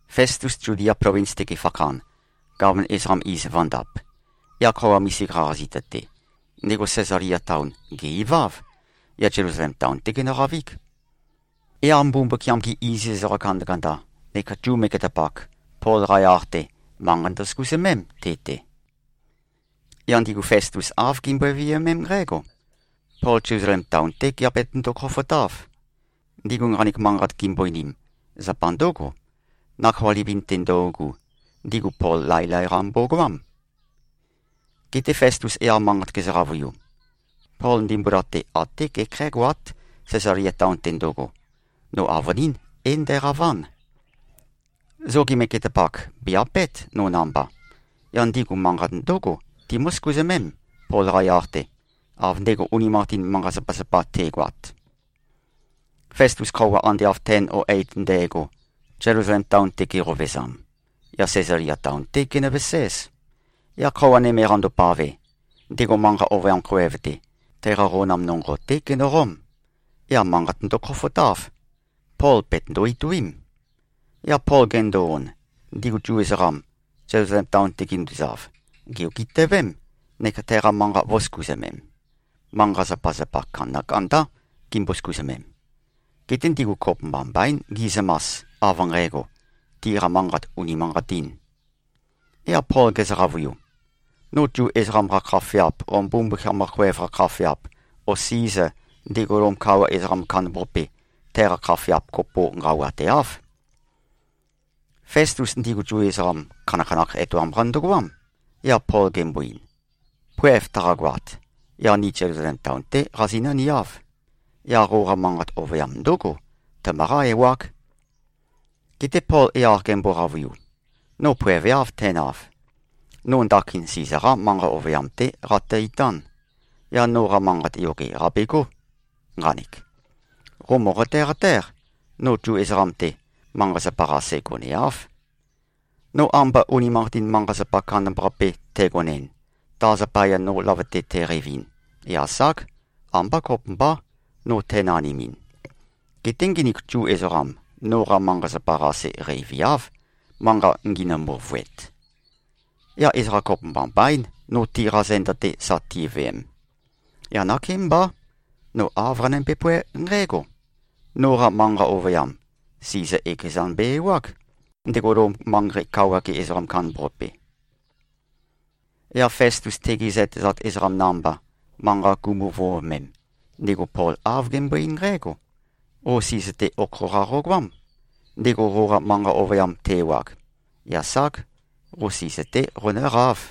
Festus Zudia plovins-te gefakhan, gaman ezoqam iz vø̄ndap, yaq khøuwa misika-qa zita-te, ndego Sæzalia taon, gè-iváv. Yaq Zelusalem taon-té genøqavíg. Yaq Mbumbukiam-gi iziz ezoqa kandakanda neka Zu megetapak, Pol-qa yaq-te, manqa ndosøkuzømém te-te. Yaq ndigu Festus āv gimbøe-viømém nqǽgo: Pol Zelusalem taon-té geabetøndo-khofotáv. Ndigu nqanek manqat gimbo-einim, zapa ndǿgo: Nakhoa livin-te ndøugu, ndigu Pol laelae-qa mbogoám. Geté Festus yaq manqat gezø-qavøiu, “Pol ndimbula-te até gekhǽgoát, Sæzalia taon-te ndøgo. No avønín, é-ndæqaván. Zogi megetapak bè-apét, no namba. Yaq ndigu manqat ndǿgo, timǿ-søkuzømém, Pol-qa yaq-te, av ndego unimanqatin manqa-zapazapa te꞉goat.” Festus khøuwa ande av ten o eit ndægo, Zelusalem taon-te geqovezam, yaq Sæzalia taon-té genøveséz. Yaq khøuwa nøme qandopave, ndego manqa ovøyam khoev-te, teqa qonam nonqo-té genøqóm. Yaq manqat ndøkhofotáv. Pol bètøndo-ituím. Yaq Pol gendo-on, ndigu Zu ezoqam, Zelusalem taon-te ginduzav, gè-ogitøvém, neka teqa manqa vø̄søkuzømem. Manqa-zapazapa kandakandá gimbo-søkuzømem. Geté ndigu kopømba mbaín gi꞉zømas, av nqægo, tiqa manqat unimanqatīn. Yaq Pol gezø-qavøiu, “No Zu ezoqam-qa khafeap o Mbumbukiam-qa khoev-qa khafeap o Siza, ndego Lom kawa ezoqam kandambaqape, teqa khafeap kopo nqawateáv.” Festus ndigu Zu ezoqam khanakhanakh etoam-qa ndøgoám, yaq Pol gembo-ein, “Poev taqagoat, yaq ni Zelusalem taon-té qazinǿ-niáv. Yaq qoqa manqa ovøyam ndǿgo, tømøqá-ewág.” Geté Pol yaq gembo-qavøiu, “No poeveáv, tænav. No ndakin Siza-qá manqa ovøyam-té qatø-itán. Yaq noqa manqat yoge qàbegó nqanek. Qo mòqote-qatéq, no Zu ezoqam-te, manqa-zapa-qase goneáv. No amba unimanqatin manqa-zapa kandambaqape tægonɨn, ta zapaya no løvøte tæqeivin, yaq ság, ambá kopømbá, no tænanimin. Geté nginik Zu ezoqam, noqa manqa-zapa-qase qeiviáv, manqa nginø-møvøet. Yaq ezoqa kopømba mbaín, no tiqa zenda-te sa tiveem. Yaq nakémbá, no āv qanømbe-póe nqǽgo: Noqa manqa ovøyam, Siza ekezan be-ewág, ndego Lom manqei-ge kawa ezoqam kandambaqape.” Yaq Festus tegi zøtezat ezoqam namba, manqa gumu-vøovomem, ndego Pol āv gembøe-eín nqǽgo, “Qo Siza-te okho-qa qogoám, ndego qoqa manqa ovøyam te-ewag. Yaq ság. Qo Siza-té qonǿqáv.”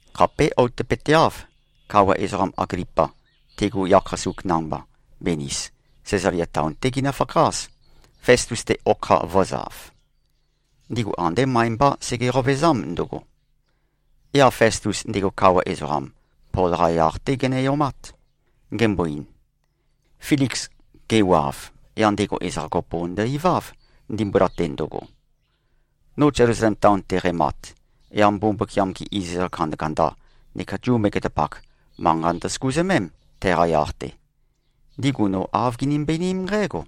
Khapé outøpøteáv, kawa ezoqam Aglipa, tegu yakhasuk namba, Benis, Sæzalia taon-té ginøfakház, Festus-te okha vø̄zav. Ndigu andé møe-mbá sege-qovezám ndøgo. Yaq Festus, ndego kawa ezoqam, Pol-qa yaq-té gene-omát. Gembo-ein, “Filiks gewav, yaq ndego ezoqa kopo ndø-iváv, ndimbula-te ndøgo. No Zelusalem taon-te qæmat, yaq Mbumbukiam-gi iziz ezoqa kandakanda neka Zu megetapak, manqa ndøsøkuzømém, teqa yaq-te. Ndigu no āv ginømbe-einím nqǽgo: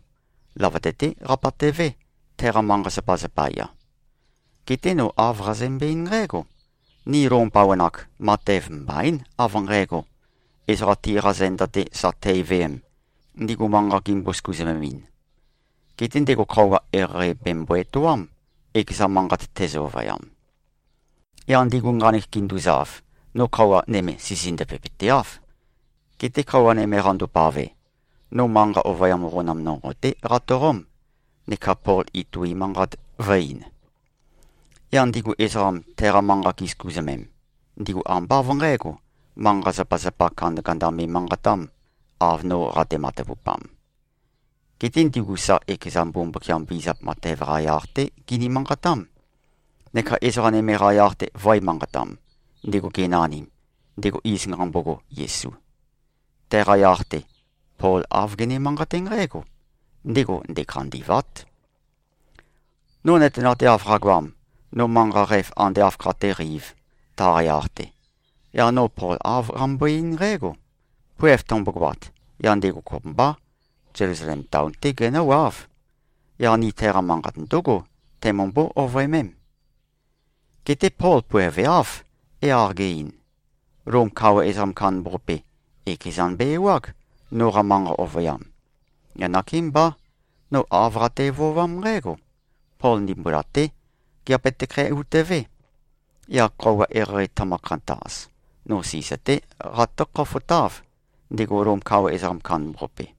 Løvøte-té qabatøvé, teqa manqa-zapa zapaya. Geté no āv qazømbe-eín nqǽgo, ‘Ni Lom bawan-ak, matev mbaín, av nqægo, ezoqa tiqa zenda-te sa teiveem, ndigu manqa gimbo-søkuzømemɨn. Geté ndego khøuwa eqeieqei bèmbo-etoám, ekeza manqat tezø-ovøyam.’ Yaq ndigu nqanek ginduzav, no khøuwa nøme sisindøvepøteáv. Geté khøuwa nøme qandopave, no manqa ovøyam qonam nonqo-té qatoqóm, neka Pol itui manqat vø̄e-ein. Yaq ndigu Zu ezoqam teqa manqa gisøkuzømem, ndigu ambá av nqǣgo, manqa-zapazapa kandakanda me꞉manqatām, av no qate-matavupam. Geté ndigu sa ekeza Mbumbukiam vizap matev-qa yaq-té gini-manqatám, neka ezoqa nøme-qa yaq-te vø̄e-manqatam, ndego genanim, ndego iz nqambogo, Yesu. Teqa yaq-te, Pol āv gene-manqaté nqǽgo, ‘Ndego ndekhandî꞉vát.’ No nøtenateav qagoam, no manqa qæf ande āv khatéqeīv, taqa yaq-te, yaq no Pol āv qambøe-eín nqǽgo. Poev tømbogoat, yaq ndego kopømbá, Zelusalem taon-té genǿwáv. Yaq ni teqa manqat ndǿgo teimømbó-ovøemém. Geté Pol poeveáv, yaq ge-ein, ‘Lom kawa ezoqam kandambaqape, ekezan be-ewág, noqa manqa ovøyam.’ Yaq nakémbá, no āv qate-vøovám nqǽgo: Pol ndimbula-té geabetøkhæ-utøvé. Yaq khøuwa eqeieqei tømø-khantaz, no Siza-té qatǿ-khofotáv, ndego Lom kawa ezoqam kandambaqape.”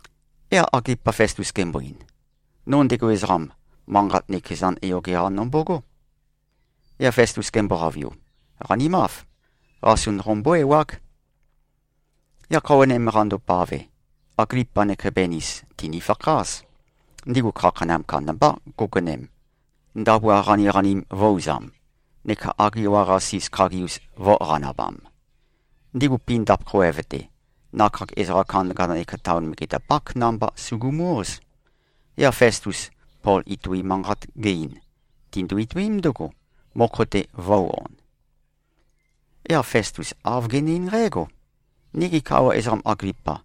Yaq Aglipa Festus gembo-ein, “No ndego ezoqam, manqat nøkezan yoge-qa nombogó.” Yaq Festus gembo-qavøiu, “Qanimáv. Qasun qombó-ewág.” Yaq khøuwa nøme qandopave, Aglipa neka Benis, tìnifakház. Ndigu khakheinam kandambá go꞉gonem, ndabua qaniqanim vø̄-uzam neka agiwa-qasis khagi-us vø̄-qanabam. Ndigu pindap khoev-te, nakhag ezoqa kandakanda neka taon megetapák namba sugumu-óz. Yaq Festus, Pol itui manqat ge-ein, tindu-ituím ndǿgo, mokho-te vø̄u-on. Yaq Festus āv gene-eín nqǽgo, “Nigi kawa ezoqam Aglipa,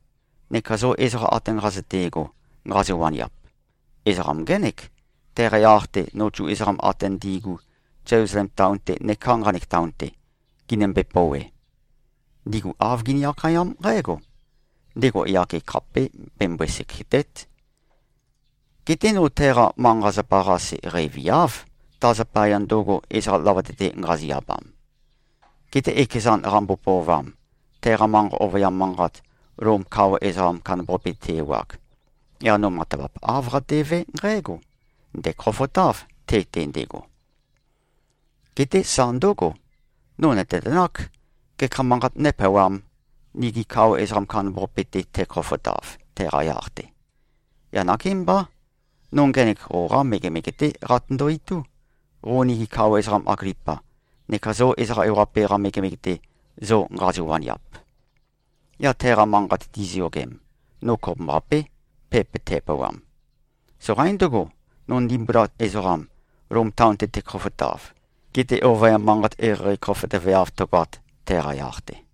neka zo ezoqa ate nqazøte꞉go, nqazo-waniap. Ezoqam ngének, teqa yaq-te, no Zu ezoqam ate ndi꞉gu, Zelusalem taon-te neká nqanek taon-te, ginømbe-pouwe. Ndigu āv gini-akhayám nqǽgo: Ndego yage khapé bembøe-sekète᷄t. Geté no teqa manqa-zapa-qase qeiviáv, ta zapaya ndøgo, ezoqa løvøte-te nqazi-abam. Geté ekezan qambo-pøovam, teqa manqa ovøyam manqat, Lom kawa ezoqam kandambaqape te-ewag, yaq no matavap āv qatevé nqǽgo: Ndæ̀khofotáv, te-te ndego. Geté sa ndǿgo. No nø̀tenøtenák, gekha manqat nópeawām, nigi kawa ezoqam kandambaqape-te tækhofotav, teqa yaq-te. Yaq nakémbá, no ngenek qoqá megemege-té qatøndo-itú, qo nigi kawa ezoqam Aglipa, neka zo ezoqa ewaqape-qa megemege-te, zo nqazo-waniap. Yaq teqa manqat tiziyogem, no kopømbaqapé, pepa tæpeawam. Soqaín ndøgo, no ndimbula ezoqam, Lom taon-te tækhofotav, gete ovøyam manqat eqeieqei khofotøveav tøgoat, teqa yaq-te.”